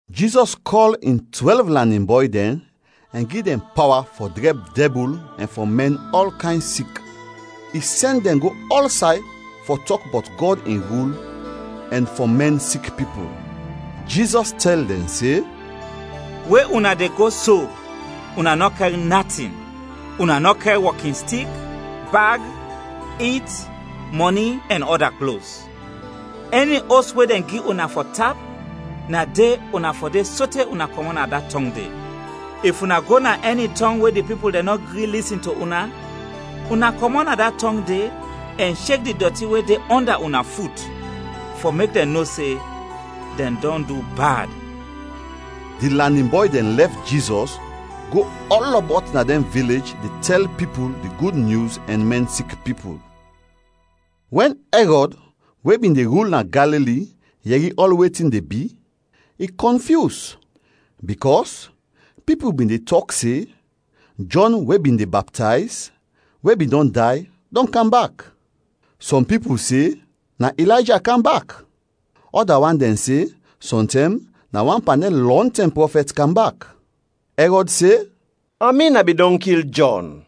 Jizɔs kɔl in twɛlv lanin bɔy dɛn ɛn gi dɛn pawa fɔ drɛb dɛbul ɛn fɔ mɛn ɔl kayn sik. I sɛn dɛn go ɔlsay fɔ tɔk bɔt Gɔd in rul ɛn fɔ mɛn sik pipul. Jizɔs tɛl dɛn se, “We una de go so, una nɔ kɛr natin. Una nɔ kɛr wɔkinstik, bag, it, mɔni, ɛn ɔda klos. Ɛni os we dɛn gi una fɔ tap, na de una fɔ de sote una kɔmɔt na da tɔng de. If una go na ɛni tɔng we di pipul dɛn nɔ gri lisin to una, una kɔmɔt na da tɔng de, ɛn shek di dɔti we de ɔnda una fut fɔ mek dɛn no se dɛn dɔn du bad.” Di lanin bɔy dɛn lɛf Jizɔs go ɔlɔbɔt na dɛn vilej de tɛl pipul di Gud Nyus ɛn mɛn sik pipul. Wɛn Ɛrɔd we bin de rul na Galili yɛri ɔl wetin de bi, i kɔnfyus bikɔs pipul bin de tɔk se Jɔn we bin de baptayz we bin dɔn day, dɔn kam bak! Sɔm pipul se na Ilayja kam bak, ɔda wan dɛn se sɔntɛm na wan pan dɛn lɔntɛm prɔfɛt kam bak. Ɛrɔd se, “Amin a bin dɔn kil Jɔn,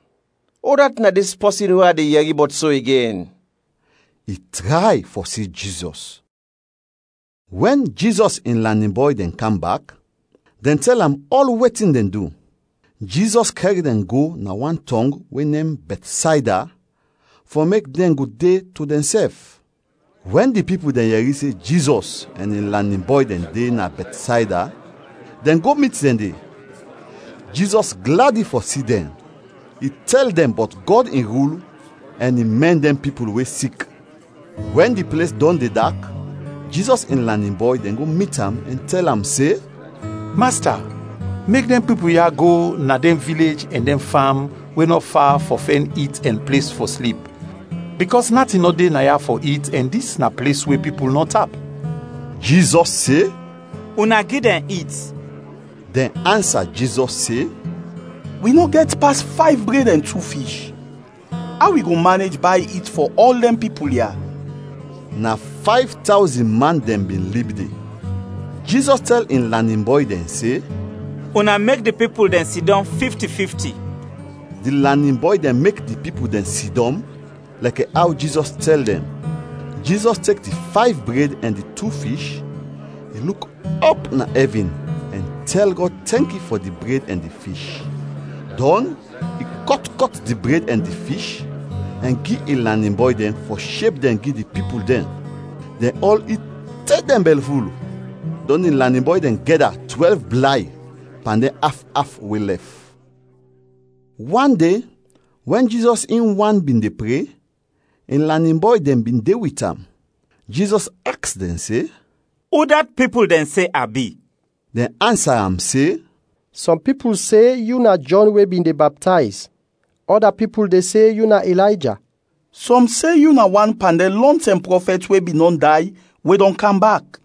udat na dis pɔsin we a de yɛri bɔt so igen?” I tray fɔ si Jizɔs. Wɛn Jizɔs in lanin bɔy dɛn kam bak, dɛn tɛl am ɔl wetin dɛn du. Jizɔs kɛr dɛn go na wan tɔng we nem Bɛtsayda fɔ mek dɛn go de to dɛnsɛf. Wɛn di pipul dɛn yɛri se Jizɔs ɛn in lanin bɔy dɛn de na Bɛtsayda, dɛn go mit dɛn de. Jizɔs gladi fɔ si dɛn. I tɛl dɛn bɔt Gɔd in rul ɛn i mɛn dɛn pipul we sik. Wɛn di ples dɔn de dak, Jizɔs in lanin bɔy dɛn go mit am ɛn tɛl am se, “Masta, mek dɛn pipul ya go na dɛn vilej, ɛn dɛn fam we nɔ fa fɔ fɛn it ɛn ples fɔ slip bikɔs natin nɔ de naya fɔ it ɛn dis na ples we pipul nɔ tap.” Jizɔs se, “Una gi dɛn it.” Dɛn ansa Jizɔs se, “Wi nɔ gɛt pas fayv bred ɛn tu fish. Aw wi go manej bay it fɔ ɔl dɛn pipul ya?” Na fayv tawzin man dɛn bin lib de. Jizɔs tɛl in lanin bɔy dɛn se, “Una mek di pipul dɛn sidɔm fifti fifti.” Di lanin bɔy dɛn mek di pipul dɛn sidɔm lɛkɛ aw Jizɔs tɛl dɛn. Jizɔs tek di fayv bred ɛn di tu fish, i luk ɔp na ɛvin ɛn tɛl Gɔd tɛnki fɔ di bred ɛn di fish, dɔn i kɔt kɔt di bred ɛn di fish ɛn gi in lanin bɔy dɛn fɔ sheb dɛn gi di pipul dɛn. Dɛn ɔl it te dɛn bɛlful, dɔn di lanin bɔy dɛn gɛda twɛlv blay pan dɛn af af we lɛf. Wan de wɛn Jizɔs in wan bin de pre, in lanin bɔy dɛn bin de wit am. Jizɔs aks dɛn se, “Udat pipul dɛn se a bi?” Dɛn ansa am se, “Sɔm pipul se yu na Jɔn we bin de baptayz. Ɔda pipul de se yu na Ilayja, sɔm se yu na wan pan dɛn lɔntɛm prɔfɛt we bin dɔn day we dɔn kam bak.”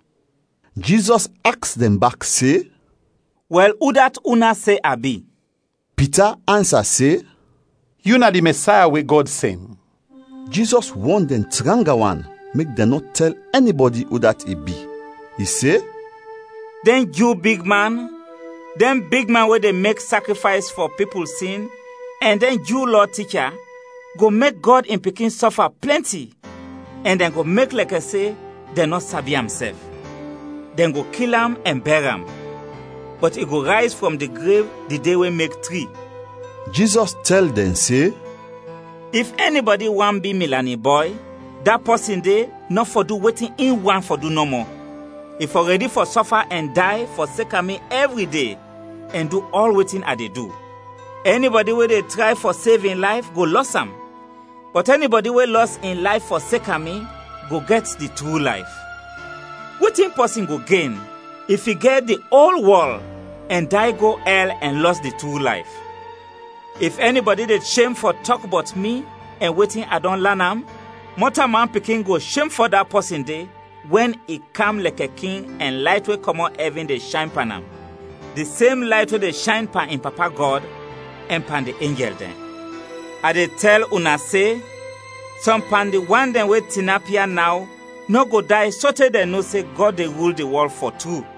Jizɔs aks dɛn bak se, “Wɛl, udat una se a bi?” Pita ansa se, “Yu na di Mɛsaya we Gɔd sɛn!” Jizɔs wɔn dɛn tranga wan mek dɛn nɔ tɛl ɛnibɔdi udat i bi. I se, “Dɛn Ju bigman, dɛn bigman we de mek sakrifays fɔ pipul sin ɛn dɛn Ju Lɔ ticha go mek Gɔd in Pikin sɔfa plɛnti ɛn dɛn go mek lɛkɛ se dɛn nɔ sabi am sɛf. Dɛn go kil am ɛn bɛr am. Bɔt i go rayz frɔm di grev di de we mek tri.” Jizɔs tɛl dɛn se, “If ɛnibɔdi want bi mi lanin bɔy, da pɔsin de nɔ fɔ du wetin in want fɔ du nɔmɔ, i fɔ rɛdi fɔ sɔfa ɛn day fɔseka mi ɛvri de ɛn du ɔl wetin a de du. Ɛnibɔdi we de tray fɔ sev in layf, go lɔs am; bɔt ɛnibɔdi we lɔs in layf fɔseka mi, go gɛt di tru layf. Wetin pɔsin go gen, if i gɛt di ol wɔl ɛn day go ɛl ɛn lɔs di tru layf? If ɛnibɔdi de shem fɔ tɔk bɔt mi ɛn wetin a dɔn lan am, Mɔtalman Pikin go shem fɔ da pɔsin de wɛn i kam lɛkɛ King ɛn layt we kɔmɔt ɛvin de shayn pan am; di sem layt we de shayn pan in Papa Gɔd, ɛn pan di enjɛl dɛn. A de tɛl una se, sɔm pan di wan dɛn we tinap ya naw nɔ go day sote dɛn no se Gɔd de rul di wɔl, fɔ tru.”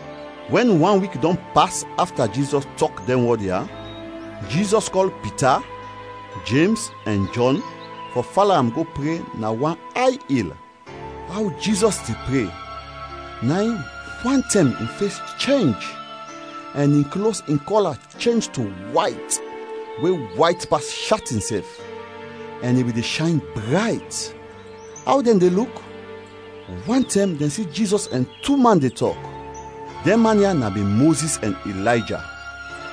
Wɛn wan wik dɔn pas afta Jizɔs tɔk dɛn wɔd ya, Jizɔs kɔl Pita, Jems ɛn Jɔn fɔ fala am go pre na wan ay il. Aw Jizɔs de pre, na in, wantɛm in fes chenj ɛn in klos in kɔla chenj to wayt, we wayt pas shatin sɛf, ɛn i bin de shayn brayt. Aw dɛn de luk, wantɛm dɛn si Jizɔs ɛn tu man de tɔk. Dɛn man ya na bin Mozis ɛn Ilayja.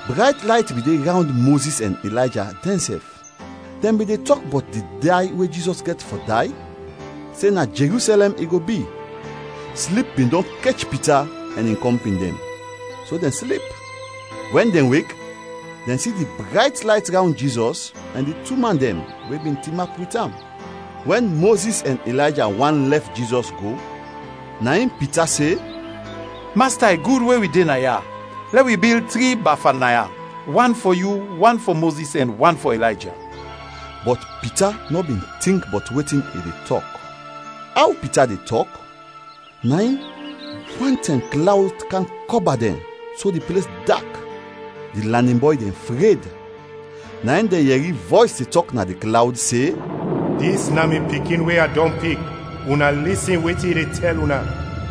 Brayt layt bin de rawnd Mozis ɛn Ilayja dɛnsɛf; dɛn bin de tɔk bɔt di day we Jizɔs gɛt fɔ day se na Jerusɛlɛm i go bi. Slip bin dɔn kech Pita ɛn in kɔmpin dɛn, so dɛn slip, wɛn dɛn wek dɛn si di brayt layt rawnd Jizɔs ɛn di tu man dɛn we bin tinap wit am. Wɛn Mozis ɛn Ilayja want lɛf Jizɔs go, na in Pita se, “Masta, i gud we wi de naya. Lɛ wi bil tri bafa naya; wan fɔ yu, wan fɔ Mozis ɛn wan fɔ Ilayja.” Bɔt Pita nɔ bin tink bɔt wetin i de tɔk. Aw Pita de tɔk, na in, wantɛm klawd kam kɔba dɛn so di ples dak; di lanin bɔy dɛn fred. Na in dɛn yɛri vɔys de tɔk na di klawd se, “Dis na mi Pikin we a dɔn pik; una lisin wetin i de tɛl una!”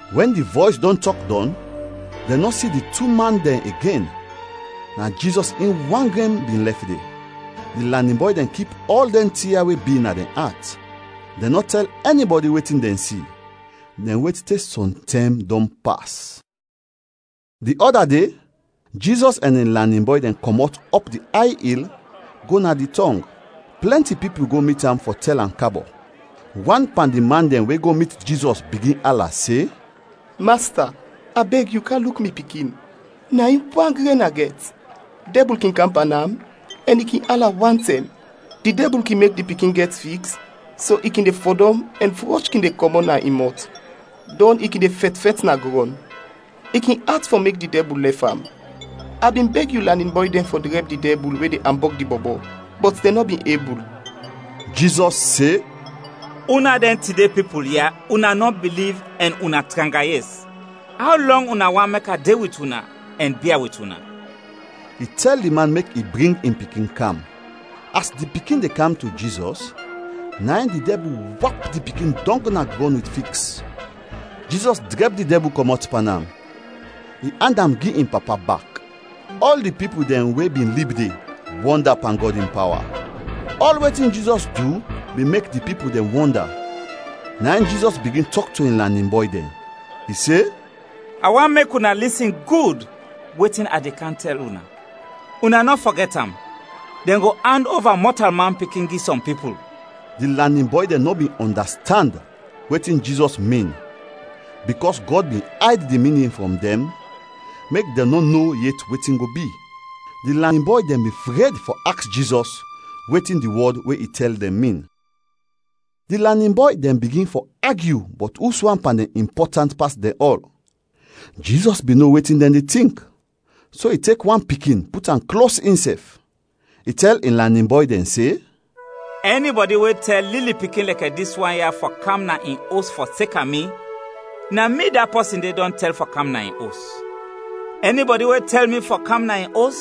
Wɛn di vɔys dɔn tɔk dɔn, dɛn nɔ si di tu man dɛn igen; na Jizɔs in wan gren bin lɛf de. Di lanin bɔy dɛn kip ɔl dɛn tin ya we bi na dɛn at. Dɛn nɔ tɛl ɛnibɔdi wetin dɛn si, dɛn wet te sɔm tɛm dɔn pas. Di ɔda de, Jizɔs ɛn in lanin bɔy dɛn kɔmɔt ɔp di ay il go na di tɔng. Plɛnti pipul go mit am fɔ tɛl am, kabɔ. Wan pan di man dɛn we go mit Jizɔs bigin ala se, “Masta, a beg yu kam luk mi pikin, na in wan gren a gɛt! Dɛbul kin kam pan am ɛn i kin ala wantɛm. Di dɛbul kin mek di pikin gɛt fiks so i kin fɔdɔm ɛn frɔsh kin de kɔmɔt na in mɔt, dɔn i kin de fɛt fɛt na grɔn. I kin at fɔ mek di dɛbul lɛf am. A bin beg yu lanin bɔy dɛn fɔ drɛb di dɛbul we de ambɔg di bɔbɔ, bɔt dɛn nɔ bin ebul.” Jizɔs se, “Una dɛn tide pipul ya, una nɔ biliv ɛn una tranga yes! Aw lɔng una want fɔ mek a de wit una ɛn bia wit una?” I tɛl di man mek i bring in pikin kam. As di pikin de kam to Jizɔs, na in di dɛbul wap di pikin dɔng na grɔn wit fiks. Jizɔs drɛb di dɛbul kɔmɔt pan am, i and am gi in papa bak. Ɔl di pipul dɛn we bin lib de, wɔnda pan Gɔd in pawa. Ɔl wetin Jizɔs du bin mek di pipul dɛn wɔnda, na in Jizɔs bigin tɔk to in lanin bɔy dɛn. I se, “A want mek una lisin gud wetin a de kam tɛl una. Una nɔ fɔgɛt am! Dɛn go and ova Mɔtalman Pikin gi sɔm pipul.” Di lanin bɔy dɛn nɔ bin ɔndastand wetin Jizɔs min bikɔs Gɔd bin ayd di minin frɔm dɛn mek dɛn nɔ no yet wetin go bi. Di lanin bɔy dɛn bin fred fɔ aks Jizɔs wetin di wɔd we i tɛl dɛn min. Di lanin bɔy dɛn bigin fɔ agyu bɔt uswan pan dɛn impɔtant pas dɛn ɔl. Jizɔs bin no wetin dɛn de tink, so i tek wan pikin put am klos insɛf. I tɛl in lanin bɔy dɛn se, “Ɛnibɔdi we tɛl lili pikin lɛkɛ dis wan ya fɔ kam na in os fɔseka mi, na mi da pɔsin de dɔn tɛl fɔ kam na in os; ɛnibɔdi we tɛl mi fɔ kam na in os,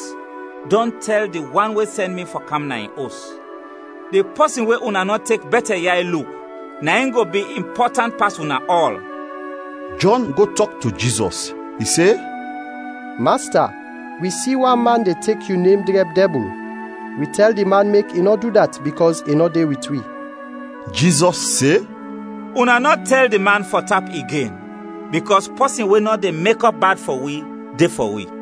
dɔn tɛl di Wan we sɛn mi fɔ kam na in os. Di pɔsin we una nɔ tek bɛtɛ yay luk, na in go bi impɔtant pas una ɔl.” Jɔn go tɔk to Jizɔs. I se, “Masta, wi si wan man de tek yu nem drɛb dɛbul. Wi tɛl di man mek i nɔ du dat bikɔs i nɔ de wit wi.” Jizɔs se, “Una nɔ tɛl di man fɔ tap igen bikɔs pɔsin we nɔ de mekɔp bad fɔ wi, de fɔ wi.”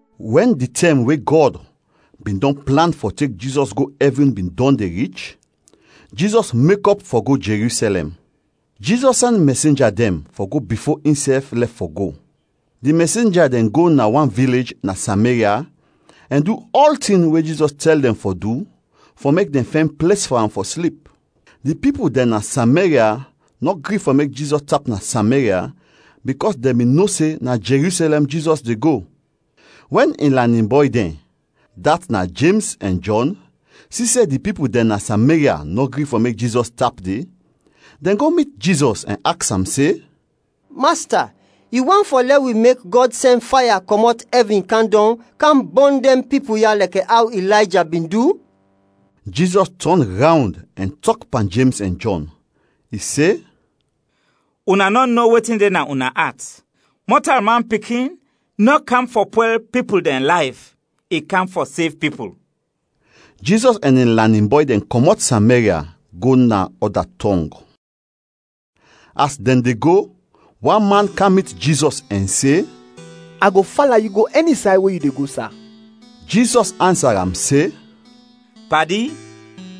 Wɛn di tɛm we Gɔd bin dɔn plan fɔ tek Jizɔs go ɛvin bin dɔn de rich, Jizɔs mekɔp fɔ go Jerusɛlɛm. Jizɔs sɛn mɛsenja dɛn fɔ go bifo insɛf lɛf fɔ go. Di mɛsenja dɛn go na wan vilej na Sameria ɛn du ɔltin we Jizɔs tɛl dɛn fɔ du fɔ mek dɛn fɛn ples fɔ am fɔ slip. Di pipul dɛn na Sameria nɔ gri fɔ mek Jizɔs tap na Sameria bikɔs dɛn bin no se na Jerusɛlɛm Jizɔs de go. Wɛn in lanin bɔy dɛn, dat na Jems ɛn Jɔn, si se di pipul dɛn na Sameria nɔ gri fɔ mek Jizɔs tap de, dɛn go mit Jizɔs ɛn aks am se, “Masta, yu want fɔ lɛ wi mek Gɔd sɛn faya kɔmɔt ɛvin kam dɔng kam bɔn dɛn pipul ya [lɛkɛ aw Ilayja bin du?]” Jizɔs tɔn rawnd ɛn tɔk pan Jems ɛn Jɔn. [I se, “Una nɔ no wetin de na una at. Mɔtalman Pikin nɔ kam fɔ pwɛl pipul dɛn layf, i kam fɔ sev pipul.”] Jizɔs ɛn in lanin bɔy dɛn kɔmɔt Samaria go na ɔda tɔng. As dɛn de go, wan man kam mit Jizɔs ɛn se, “A go fala yu go ɛni say we yu de go, sa!” Jizɔs ansa am se, “Padi,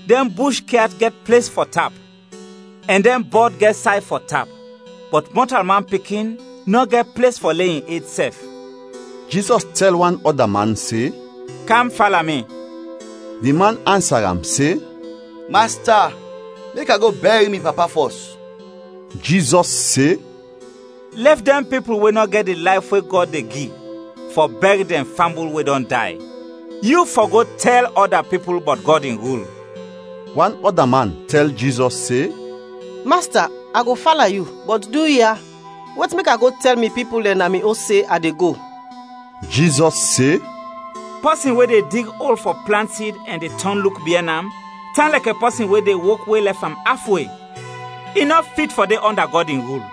dɛn bush kyat gɛt ples fɔ tap ɛn dɛn bɔd gɛt say fɔ tap, bɔt Mɔtalman Pikin nɔ gɛt ples fɔ le in ed sɛf.” Jizɔs tɛl wan ɔda man se, “Kam fala mi!” Di man ansa am se, “Masta, mek a go bɛr mi papa fɔs.” Jizɔs se, “Lɛf dɛn pipul we nɔ gɛt di layf we Gɔd de gi fɔ bɛr dɛn fambul we dɔn day, yu fɔ go tɛl ɔda pipul bɔt Gɔd in rul.” Wan ɔda man tɛl Jizɔs se, “Masta, a go fala yu, bɔt duya, wet mek a go tɛl mi pipul dɛn na mi os se a de go.” Jizɔs se, “Pɔsin we de dig ol fɔ plant sid ɛn de tɔn luk biɛn am, tan lɛkɛ pɔsin we de wok we lɛf am af we; i nɔ fit fɔ de ɔnda Gɔd in rul.”